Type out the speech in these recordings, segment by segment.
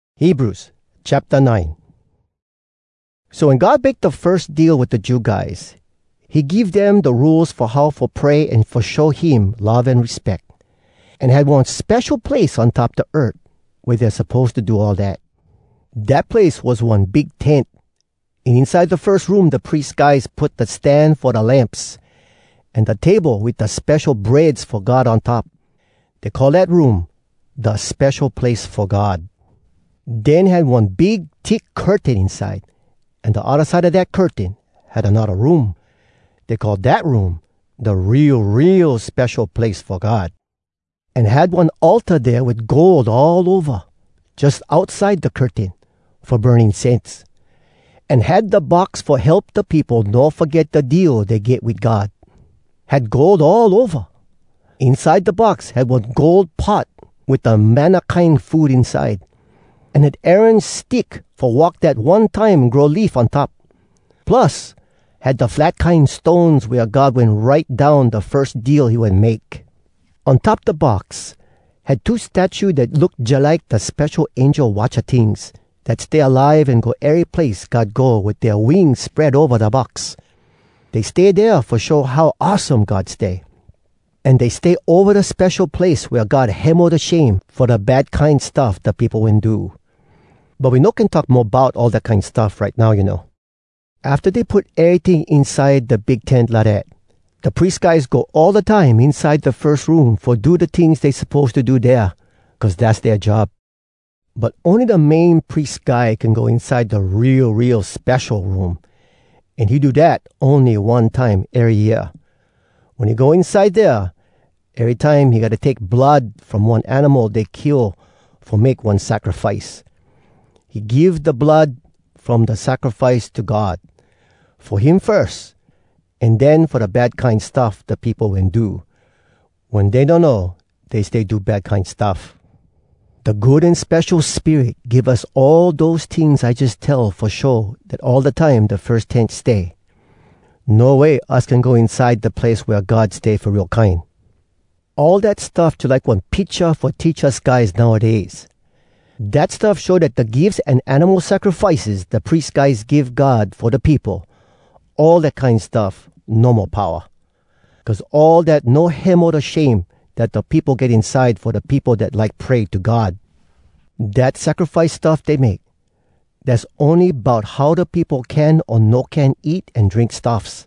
So wen God make da firs deal wit da Jew guys, he give dem da Rules fo how fo pray an fo show him love an respeck. An had one spesho place on top da earth wea dey suppose to do all dat. Dat place was one big tent, an inside da firs room da pries guys put da stan fo da lamps, an da table wit da Spesho Breads fo God on top. Dey call dat room “Da Spesho Place fo God.” Den had one big thick curtain inside, an da odda side a dat curtain had anodda room. Dey call dat room “Da Real, Real Spesho Place Fo God.” An had one altar dea wit gold all ova, jus outside da curtain, fo burn incense. An had da Box Fo Help Da Peopo No Foget Da Deal Dey Get Wit God. Had gold all ova. Inside da Box had one gold pot wit da manna kine food inside. An had Aaron stick fo walk dat one time grow leaf on top. Plus, had da flat kine stones wea God wen write down da firs deal he wen make. On top da Box, had two statue dat look jalike da spesho angel watcha tings dat stay alive an go ery place God go wit dea wings spread ova da Box. Dey stay dea fo show how awesome God stay. An dey stay ova da spesho place wea God hemo da shame fo da bad kine stuff da peopo wen do. But we no can talk mo bout all dat kine stuff right now, you know. Afta dey put eryting inside da big tent lidat, da pries guys go all da time inside da firs room fo do da tings dey suppose to do dea, cuz dass dea job. But ony da Main Pries Guy can go inside da Real, Real Spesho Room, an he do dat ony one time ery year. Wen he go inside dea, erytime he gotta take blood from one animal dey kill fo make one sacrifice. He give da blood from da sacrifice to God—fo him firs, an den fo da bad kine stuff da peopo wen do, wen dey donno dey stay do bad kine stuff. Da Good An Spesho Spirit give us all dose tings I jus tell fo show dat all da time da firs tent stay, no way us can go inside da place wea God stay fo real kine. All dat stuff jalike one picha fo teach us guys nowdays. Dat stuff show dat da gifs an animal sacrifices da pries guys give God fo da peopo, all dat kine stuff no mo powa. Cuz all dat no hemo da shame dat da peopo get inside fo da peopo dat like pray to God. Dat sacrifice stuff dey make, dass ony bout how da peopo can o no can eat an drink stuffs,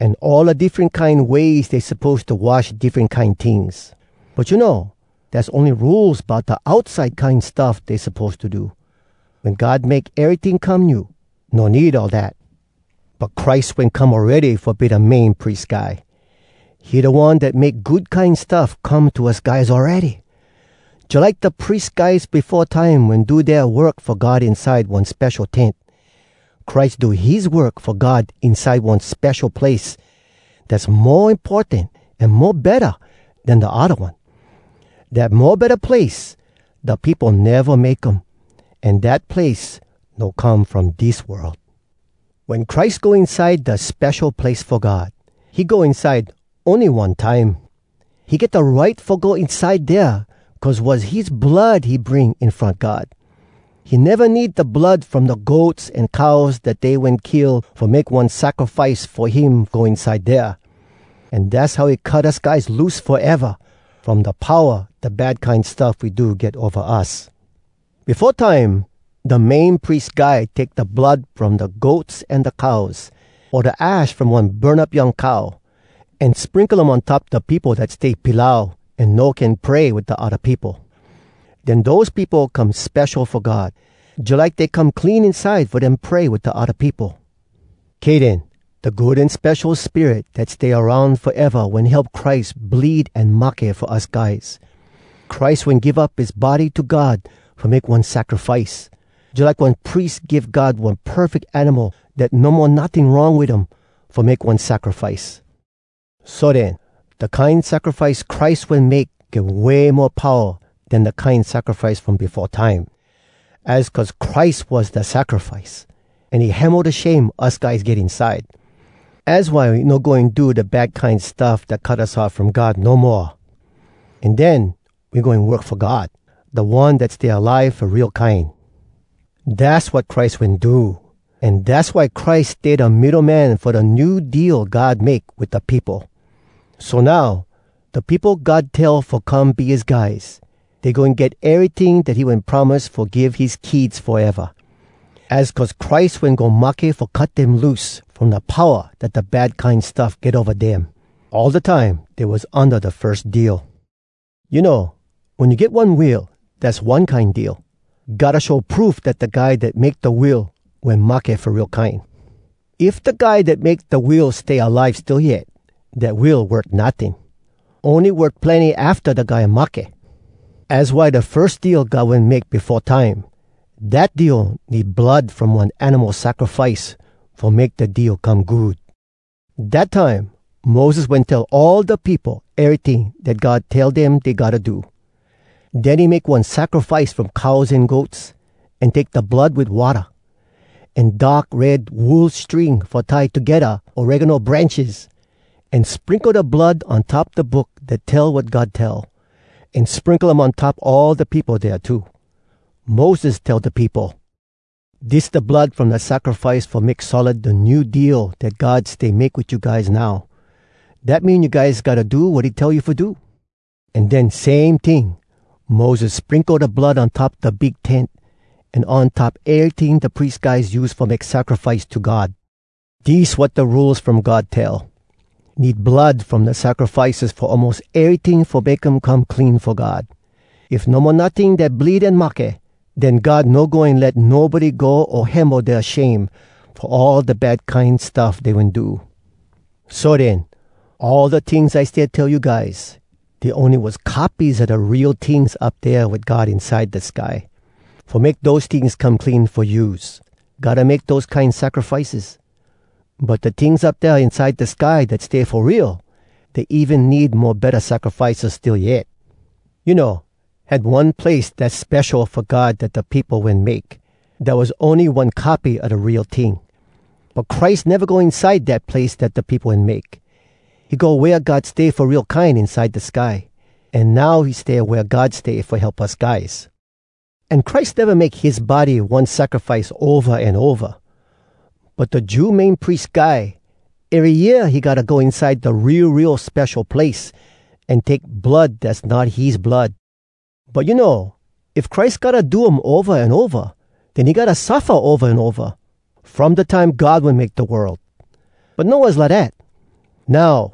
an all da diffren kine ways dey suppose to wash diffren kine tings. But you know, dass ony rules bout da outside kine stuff dey suppose to do. Wen God make eryting come new, no need all dat. But Christ wen come awready fo be da Main Pries Guy. He da One dat make good kine stuff come to us guys awready. Jalike da pries guys befo time wen do dea work fo God inside one spesho tent, Christ do his work fo God inside one spesho place dass mo importan an mo betta den da odda one. Dat mo betta place, da peopo neva make um, an dat place no come from dis world. Wen Christ go inside da Spesho Place fo God, he go inside ony one time. He get da right fo go inside dea, cuz was his blood he bring in front God. He neva need da blood from da goats an cows dat dey wen kill fo make one sacrifice fo him go inside dea. An dass how he cut us guys loose foeva from da powa da bad kine stuff we do get ova us. Befo time, da Main Pries Guy take da blood from da goats an da cows, o da ash from one burn up young cow, an sprinkle um on top da peopo dat stay pilau an no can pray wit da odda peopo. Den dose peopo come spesho fo God, jalike dey come clean inside fo dem pray wit da odda peopo. Kay den, da Good An Spesho Spirit dat stay aroun foeva wen help Christ bleed an mahke fo us guys. Christ wen give up his body to God fo make one sacrifice, jalike one pries give God one perfeck animal dat no mo notting wrong wit um fo make one sacrifice. So den, da kine sacrifice Christ wen make get way mo powa den da kine sacrifice from befo time. Az cuz Christ was da sacrifice, an he hemo da shame us guys get inside. Az why we no goin do da bad kine stuff dat cut us off from God no moa. An den we goin work fo God, da One dat stay alive fo real kine. Dass wat Christ wen do. An dass why Christ stay da middo man fo da New Deal God make wit da peopo. So now, da peopo God tell fo come be his guys, dey goin get eryting dat he wen promise fo give his kids foeva. Az cuz Christ wen go mahke fo cut dem loose from da powa dat da bad kine stuff get ova dem, all da time dey was unda da firs deal. You know, wen you get one will, dass one kine deal. Gotta show proof dat da guy dat make da will wen mahke fo real kine. If da guy dat make da will stay alive still yet, dat will worth notting. Ony worth plenny afta da guy mahke. Az why da firs deal God wen make befo time, dat deal need blood from one animal sacrifice fo make da deal come good. Dat time, Moses wen tell all da peopo eryting dat God tell dem dey gotta do. Den he make one sacrifice from cows an goats, an take da blood wit watta, an dark red wool string fo tie togedda oregano branches, an sprinkle da blood on top da Book dat tell wat God tell, an sprinkle um on top all da peopo dea too. Moses tell da peopo, “Dis da blood from da sacrifice fo make solid da New Deal dat God stay make wit you guys now. Dat mean you guys gotta do wat he tell you fo do.” An den same ting, Moses sprinkle da blood on top da big tent, an on top eryting da pries guys use fo make sacrifice to God. Dis wat da Rules From God tell: Need blood from da sacrifices fo almos eryting fo make um come clean fo God. If no mo notting dat bleed an mahke, den God no goin let nobody go o hemo dea shame fo all da bad kine stuff dey wen do. So den, all da tings I stay tell you guys, dey ony was copies a da real tings up dea wit God inside da sky. Fo make dose tings come clean fo use, gotta make dose kine sacrifices. But da tings up dea inside da sky dat stay fo real, dey even need mo betta sacrifices still yet. You know, had one place dass spesho fo God dat da peopo wen make, dat was ony one copy a da real ting. But Christ neva go inside dat place dat da peopo wen make. He go wea God stay fo real kine inside da sky, an now he stay wea God stay fo help us guys. An Christ neva make his body one sacrifice ova an ova. But da Jew Main Pries Guy, ery year he gotta go inside da Real, Real Spesho Place, an take blood dass not his blood. But you know, if Christ gotta do um ova an ova, den he gotta suffa ova an ova, from da time God wen make da world. But no was lidat. Now,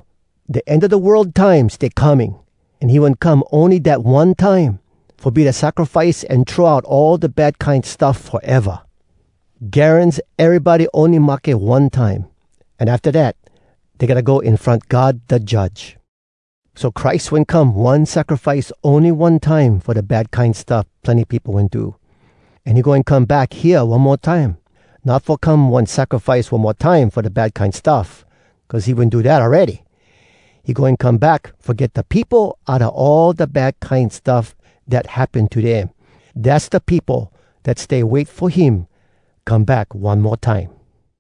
da end a da world time stay coming, an he wen come ony dat one time, fo be da sacrifice an throw out all da bad kine stuff foeva. Garans erybody ony mahke one time, an afta dat, dey gotta go in front God da Judge. So Christ wen come one sacrifice ony one time fo da bad kine stuff plenny peopo wen do. An he goin come back hea one mo time, not fo come one sacrifice one mo time fo da bad kine stuff, cuz he wen do dat awready. He goin come back fo get da peopo outa all da bad kine stuff dat happen to dem—dass da peopo dat stay wait fo him come back one mo time.